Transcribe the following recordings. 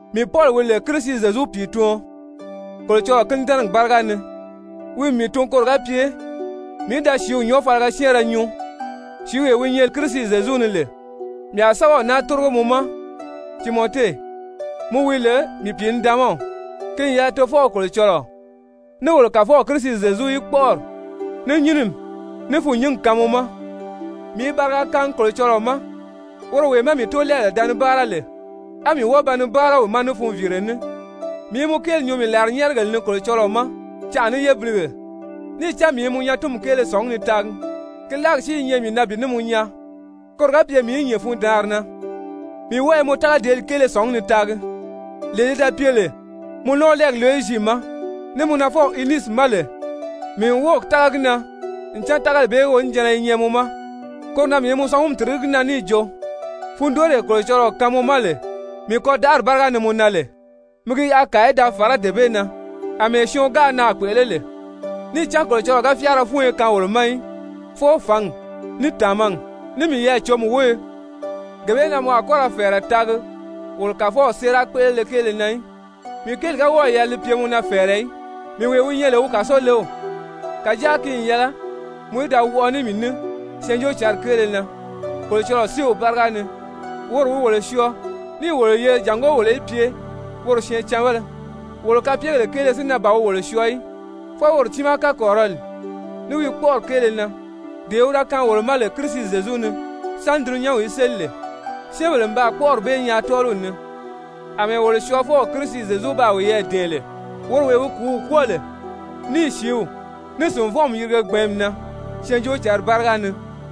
Mii Pɔli, wi lè Kirisi Zyezu pìituɔn Kolocɔlɔɔ kínidɛnɛgi báriga ni, wi n mii tun koro ga pye mii í da sìíw nyɔɔfaliga syɛ́ɛnrɛ nyuu, sìíwee wi nyɛ Kirisi Zyezu ni lè. Mii a sɛ́bɛw naa tórigo mɔ ma, Timɔte, mɔ wi lè mii pìinidaanmaw, ki n yɛlɛ Tofɔw Kolocɔlɔɔ ní wolo Kàfɔw Kirisi Zyezu í kpɔ́ʔɔri, ní nyínimi, ní fûnnyingi kaan mɔ ma! Mii i bariga kaangi Kolocɔlɔɔ ma, woro wee má mii tóolɛɛbèle da ni báara lè, á mii wɔ́ɔ ba ni báara wi ma ní funviire ní, mii i mɔ kéeli nyuu mii làrinyɛɛrigèle ni Kolocɔlɔɔ ma canʔa ní yébilige. Níì cán mii i mɔ nyatinmi kéele sɔ̀ngí ni taagi, ki láagi si i nyɛ mii na bi ní mɔ nyaa, koro ga pye mii í nyìn fundaanri na. Mii wɔ́ɔ i mɔ tágadeeli kéele sɔ̀ngí ni taagi, lee li da pye lè mɔ nɔɔlɛɛgi Lowizi ma, ní mɔ nafɔw Unisi ma lè, mii n wɔ́ɔ̀ tága gi na ncan tágali bee wonijanna li nyɛ mɔ ma. Koro na mii i mɔ sɔngumi tìrigí gi na níì jo, fundooree Kolocɔlɔɔ kaan mɔ ma lè mii kɔdaʔari báriga ni mɔ na lè, mi gi yaʔa kàa í da fàrá dee bee na àmɛɛ syɔɔn gáā naà kpèʔelé lè. Níì cán Kolocɔlɔɔ ga fyáara fúnyo kaan wolo ma í, fwɔɔ fǎngi, ní tàmagi, ní miyɛɛ-cǒmi wóyo. Gee bee na mɔ a kɔ́ ra fɛ̀ɛrɛ taagi wolo Kàfɔw séera kpéʔelele kéele na í, mii kéeli ga wɔ́ɔ̀ yɛlɛ li pye mɔ na fɛ̀ɛrɛ í, mii wee wi nyɛ lè wi kàsolew. Kàjáa ki n yɛlɛ mɔ í da wɔʔɔ ní mii ní Syɛɛnjóocǎnri kéele na Kolocɔlɔɔ séew báriga ni. Woro wi wolo syɔɔ níì wolo yeri jàngó wolo í pye woro syɛɛncanbéle, wolo kapyegèle kéele si na ban wi wolo syɔɔ í, fwɔɔ woro tiimaa kakɔrirɔli, ní wi kpɔ́ʔɔri kéele na, dee wi da kaan wolo ma lè Kirisi Zyezu ni sáni dulunyanw í séli lè. Syɛ́ɛnbèle n baa kpɔ́ʔɔri bee nyaa tɔ́ɔliw ni àmɛɛ wolo Syɔɔfɔw Kirisi Zyezu baa wiyɛɛ dɛ̀ɛn lè, woro wee wi kùúw kwɔ́ɔ lè, níì sìíw, ní sìnvɔnʔɔmi yirige gbɛ̀ɛ́nmi na Syɛɛnjóocǎnri báriga ni.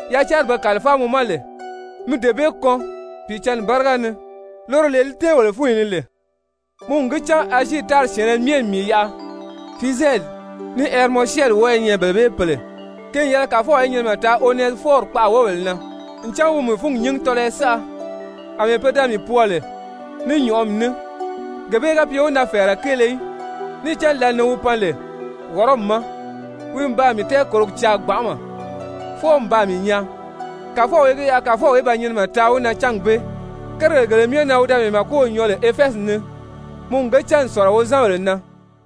Yacanri be kàlifáa mɔ ma lè, mi dee bee kɔn Pìicǎnni báriga ni, loro lee li tɛ́ɛn wolo fúnyi ni lè. Mɔ n gi cán Azii tári syɛ̀ɛnnɛ myɛ n mii yaʔa. Fizyɛli ní Hɛrimɔsyɛni wɔ́ɔ i nyɛ bele bee pèle. Ki n yɛlɛ Kàfɔw í nyinimɛ taa Onɛsifɔri kpaʔa wóbèle na, ncan wi n mii fúngi nyíngi tɔlɔyɔ saʔa, àmɛɛ pe da mii pwɔɔ lè ní nyɔ̀ʔɔmi ní, gee bee ga pye wi na fɛ̀ɛrɛ kéele í. Níì cán lǎli ni wi pan lè Wɔrɔmi ma, wi n baa mii tɛɛkòrogi caa gbanʔama fwɔɔ n baa mii nyaa. Kàfɔw í gi yaʔa Kàfɔw í ba nyinimɛ taa wi na cángi bee. Kérigèle gele myɛ na wi da mii màkow nyɔɔ lè Efɛzi ni, mɔ n ge cán n sɔ̀lɔ wozanbèle na.